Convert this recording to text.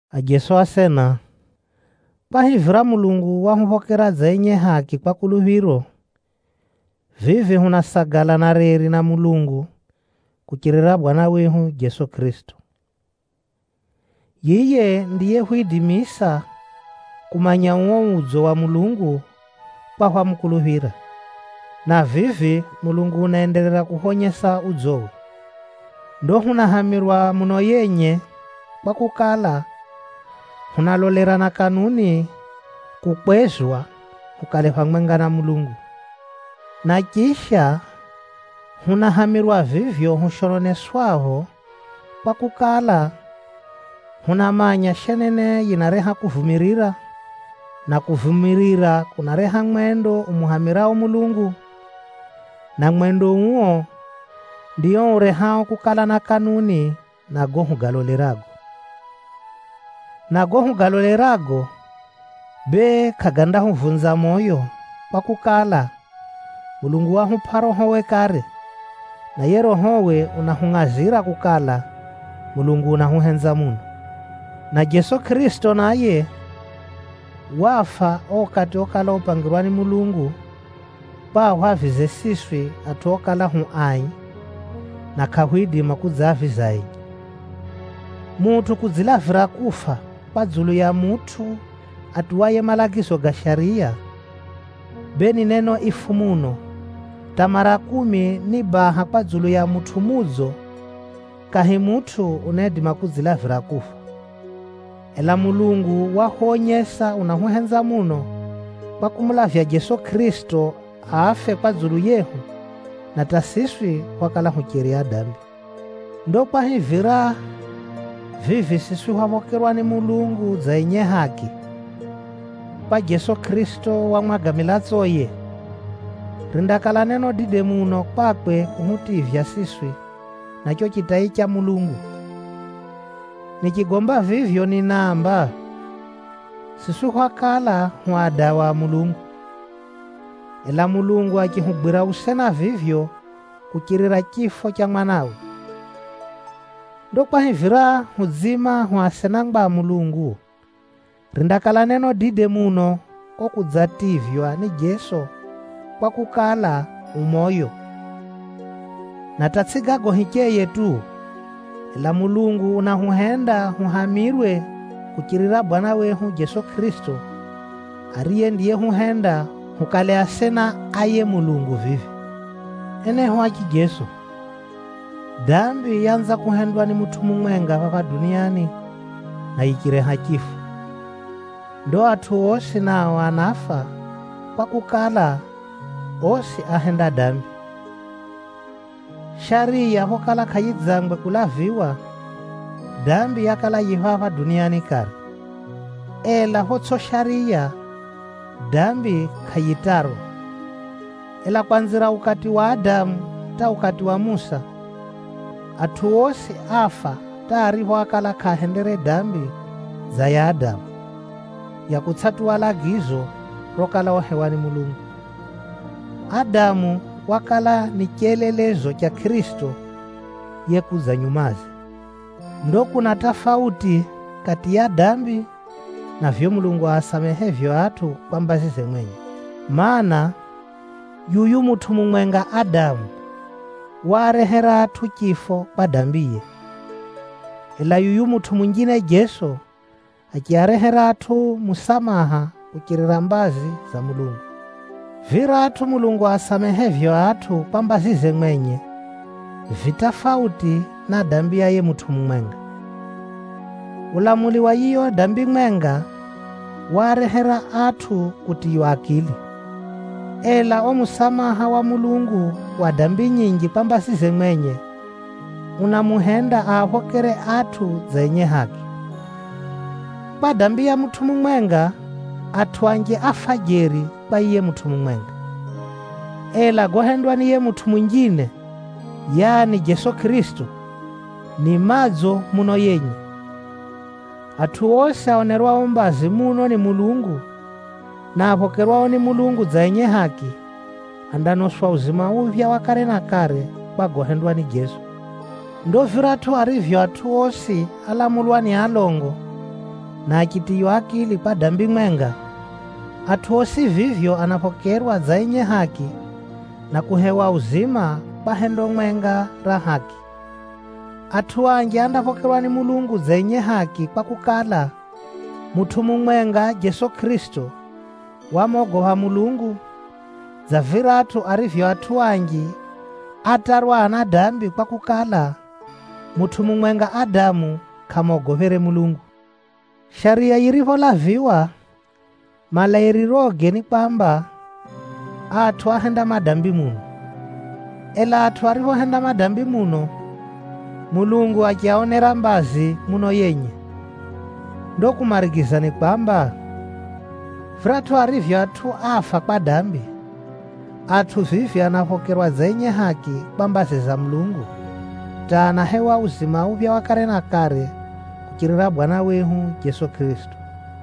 Ajeso asena, kwahivira Mulungu wahuphokera dza enye haki kwa kuluphiro, vivi hunasagala na reri na Mulungu, kuchirira Bwana wehu Jeso Kʼirisito. Yiye ndiyehwidimisa kumanya uo udzo wa Mulungu kwa hwamukuluphira, na vivi Mulungu unaenderera kuhwonyesa udzowe. Ndo hunahamirwa muno yenye, kwakukala, hunalolera na kanuni kukwezwa, hukale phamwenga na Mulungu. Na chisha, hunahamirwa vivyo hushononeswapho, kwakukala, hunamanya shenene yinareha kuvumirira, na kuvumirira kunareha mwendo umuhamirao Mulungu, na mwendo uo, ndio urehao kukala na kanuni na gago hugalolerago. Na gago hugalolerago, bee kʼagandahuvunza moyo kwakukala, Mulungu wahupʼa Rohowe kare, na yiye Rohowe unahungʼazira kukala, Mulungu unahuhenza muno. Na Jeso Kʼirisito naye, wafa o ukati okala upangirwa ni Mulungu, kwa ahwavize siswi atʼu okala hu ai, na kʼahwidima kudzaviza enye. Mutʼu kudzilavira kufa kwa dzulu ya mutʼu atuwaye malagizo ga shariya, bee ni neno ifu muno: hata mara kumi ni baha kwa dzulu ya mutʼu mudzo, kahi mutʼu unaidima kudzilavira kufa. Ela Mulungu wahwonyesa unahuhenza muno, kwa kumulavya Jeso Kʼirisito afe kwa dzulu yehu, na hata siswi hwakala hucheri adambi. Ndo kwahivira vivi siswi hwaphokerwa ni Mulungu dza enye haki, kwa Jeso Kʼirisito wamwaga milatsoye, rindakala neno dide muno kwakwe kuhutivya siswi na cho chitai cha Mulungu. Nichigomba vivyo ninaamba, siswi hwakala hu adawa a Mulungu, ela Mulungu achihugwira usena vivyo kuchirira chifo cha Mwanawe. Ndo kwahivira hudziima hu asenangwa a Mulungu, rindakala neno dide muno ko kudzativywa ni Jeso kwakukala, u moyo. Na hata tsʼi gago hicheye tu, ela Mulungu unahuhenda huhamirwe kuchirira Bwana wehu Jeso Kʼirisito, ariye ndiyehuhenda hukale asena a yiye Mulungu vivi. Enehu a chijeso, dambi yaanza kuhendwa ni mutʼu mumwenga phapha duniani, na yichireha chifo. Ndo atʼu osi nao anafa, kwakukala, osi áhenda dambi. Shariya phokala kʼayidzangwe kulaviwa, dambi yakala yi phapha duniani kare. Ela photsʼi shariya, dambi kʼayitarwa. Ela kwanzira ukati wa Adamu hata ukati wa Musa, atʼu osi áfa hata aripho ákala kʼaahendere dambi dza ya Adamu, ya kutsʼatuwa lagizo rokala uhewa ni Mulungu. Adamu wakala ni chelelezo cha Kʼirisito yekudza nyumaze. Ndo kuna tafauti kati ya dambi, na vivyo Mulungu asamehevyo atʼu kwa mbazize mwenye. Maana, yuyu mutʼu mumwenga Adamu, waarehera atʼu chifo kwa dambiye. Ela yuyu mutʼu munjine Jeso Kʼirisito, achiarehera atʼu musamaha kuchirira mbazi za Mulungu. Viratʼu Mulungu asamehevyo atʼu kwa mbazize mwenye, vi tafauti na dambi ya yiye mutʼu mumwenga. Ulamuli wa yiyo dambi mwenga, waarehera atʼu kutiywa akili. Ela o musamaha wa Mulungu wa dambi nyinji kwa mbazize mwenye, unamuhenda aaphokere atʼu dza enye haki. Kwa dambi ya mutʼu mumwenga, atʼu anji áfa jeri kwa yiye mutʼu mumwenga. Ela gohendwa ni yiye mutʼu munjine, yaani Jeso Kʼirisito, ni madzo muno yenye. Atʼu osi aonerwao mbazi muno ni Mulungu, na aphokerwao ni Mulungu dza enye haki, andanoswa uzima uphya wa kare na kare kwa gohendwa ni Jeso. Ndo viratʼu arivyo atʼu osi álamulwa ni alongo, na achitiywa akili kwa dambi mwenga, atʼu osi vivyo anaphokerwa dza enye haki, na kuhewa uzima kwa hendo mwenga ra haki. Atʼu anji andaphokerwa ni Mulungu dza enye haki kwakukala, mutʼu mumwenga Jeso Kʼirisito wamogopha Mulungu, dza viratʼu arivyo atʼu anji átarwa adambi kwakukala, mutʼu mumwenga Adamu kʼamogophere Mulungu. Shariya yiripholaviwa, malairiroge ni kwamba, atʼu áhenda madambi muno. Ela atʼu ariphohenda madambi muno, Mulungu achiaonera mbazi muno yenye. Ndo kumarigiza ni kwamba, viratʼu arivyo atʼu áfa kwa dambi, atʼu vivi anaphokerwa dza enye haki kwa mbazi za Mulungu, hata anahewa uzima uphya wa kare na kare kuchirira Bwana wehu Jeso Kʼirisito.